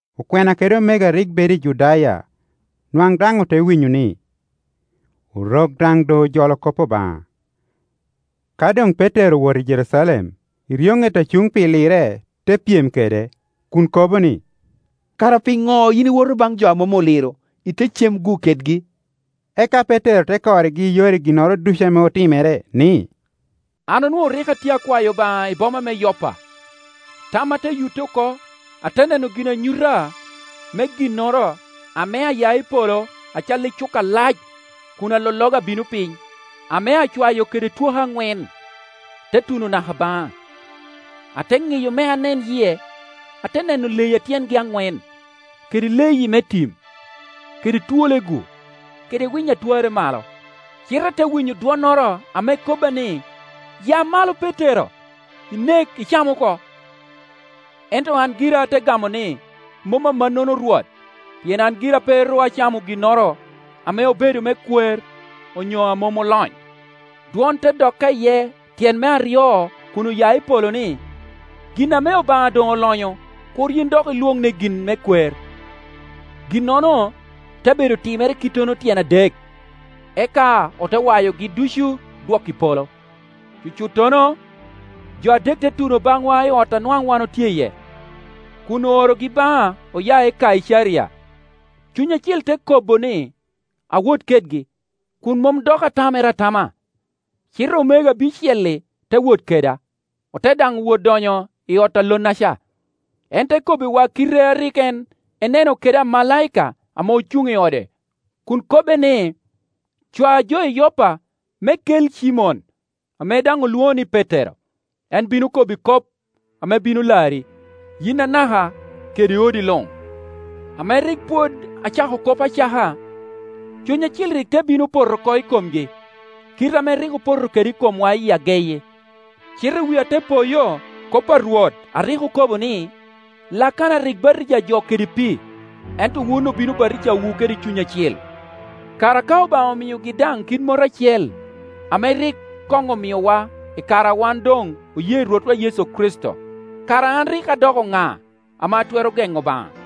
Okwena kede omego a rik bedo i Judaya nwaŋ daŋ ote winyo ni, Orok daŋ doŋ ojolo kop Obaŋa. Ka doŋ Petero owoto i Jerucalem, eryoŋet a cuŋ pi lirre te pyem kede, kun okobo ni, “Kara piŋo yin iwoto baŋ jo a mom oliro, ite cem-gu kedgi?” Eka Petero te korrigi i yore ginnoro ducu ame otimere, ni, “An onwoŋo rik a tye akwayo Obaŋa i boma me Yoppa, tamma te yutte oko, ate neno ginanyuta me ginnoro ame aya i polo acalli cuka alac kun alologa abino piny, ame acwayo kede twoke aŋwen, te tuno naka baŋa. Ate ŋiyo me anen yie, ate neno leyi a tyengi aŋwen, kede leyi me tim, kede twole-gu, kede winy a twarre malo. Cite ate winyo dwonnoro ame kobba ni, ‘Ya malo Petero, inek, icam oko.’ Ento an gira ate gamo ni, ‘Mom amannono Rwot, pien an gira pe ru acamo ginnoro ame obedo me kwer onyo a mom olony.’ Rwot te dokka iye tyen me aryo kun oya i polo ni, ‘Gin ame Obaŋa doŋ olonyo, kur yin dok ilwoŋ ni gin me kwer.’ Ginnono te bedo timere kittono tyen adek, eka ote wayogi ducu dwoko i polo. Cucuttono jo adek te tuno baŋwa i ot a nwaŋ wan otye iye, kun oorogi baŋa, oya i Kaicaria. Cuny Acil te kobo ni awot kedgi, kun mom dok atamere atama. Cite omego abicel-li te wot keda, ote daŋ wot donyo i ot a lonnaca. En te kobbiwa kite a rik en eneno kede amalaika ame ocuŋ i ode kun kobbe ni, ‘Cwa jo i Yoppa me kel Cimon ame daŋ olwoŋo ni Petero. En bino kobbi kop ame bino lari, yin anaka kede odi luŋ.’ Ame rik pwod acako kop acaka, Cuny Acil rik te bino poto oko i komgi, kite ame rik opoto kede i komwa i ageyi. Cite wia te poyo kop a Rwot a rik okobo ni, ‘Lakana rik batija jo kede pii, ento wun obino batijawu kede Cuny Acil.’ Kara ka Obaŋa omiogi daŋ kit mot acel ame rik koŋ omiowa i kare a wan doŋoye Rwotwa Yecu Kricito, kara an rik adoko ŋa ame atwero geŋo Obaŋa?”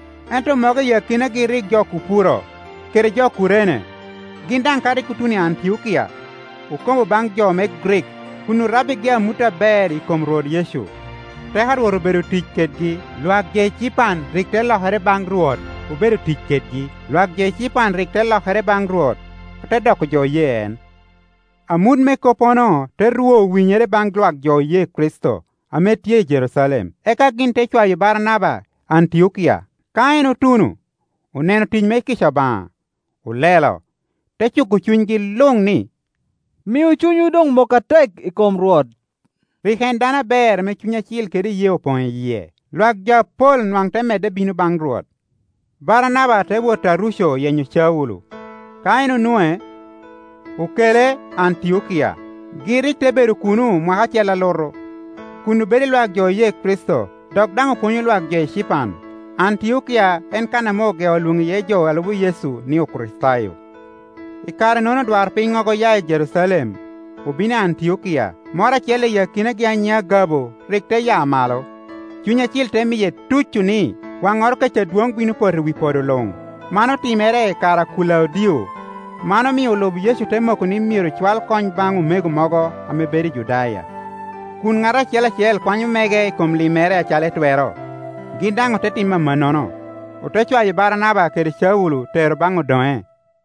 Ento mogo i akinagi rik jo Kupuro kede jo Kurene; gin daŋ ka rik otuno i Antiokia, okobo baŋ jo me Grik, kun orabbigi amut aber i kom Rwot Yecu. Teko a Rwot obedo tic kedgi, lwak jo ecipan rik te lokere baŋ Rwot obedo tic kedgi, lwak jo ecipan rik te lokere baŋ Rwot ote doko jo oye en. Amut me koppono te rwo winyere baŋ lwak jo oye Kricito ame tye i Jerucalem, eka gin te cwayo Baranaba i Antiokia. Ka en otuno, oneno tic me kica Obaŋa, olelo, te cuko cunygi luŋ ni, “Miu cunywu doŋ mok atek i kom Rwot.” Rik en dano aber ame Cuny Acil kede iyee Opoŋ i yie. Lwak jo apol nwaŋ te medde bino baŋ Rwot. Baranaba te wot Taruco yenyo Caulo. Ka en onwoŋe, okele i Antiokia. Gin rik te bedo kunu mwaka acel alutu, kun obedo i lwak jo oye Kricito dok daŋ opwonyo lwak jo ecipan. Antiokia en kan ame ogeo lwoŋo iye jo a lubo Yecu ni, Okricitayo. I kare-nono odwarpinnyogo oya i Jerucalem, obino i Antiokia. Moro acel i akinagi a nyiŋe Agabo rik te ya malo, Cuny Acil te miye tuco ni, waŋŋoro kec adwoŋ bino poto i wi podo luŋ; man otimere i kare a Kulaudio. Man omio olub Yecu te moko ni myero cwal kony baŋ omego mogo a bedo i Judaya, kun ŋat acel acel kwanyo mege i kom limmere acalo etwero. Gin daŋ ote timo amannono, ote cwayo Baranaba kede Caulo tero baŋ odoŋe.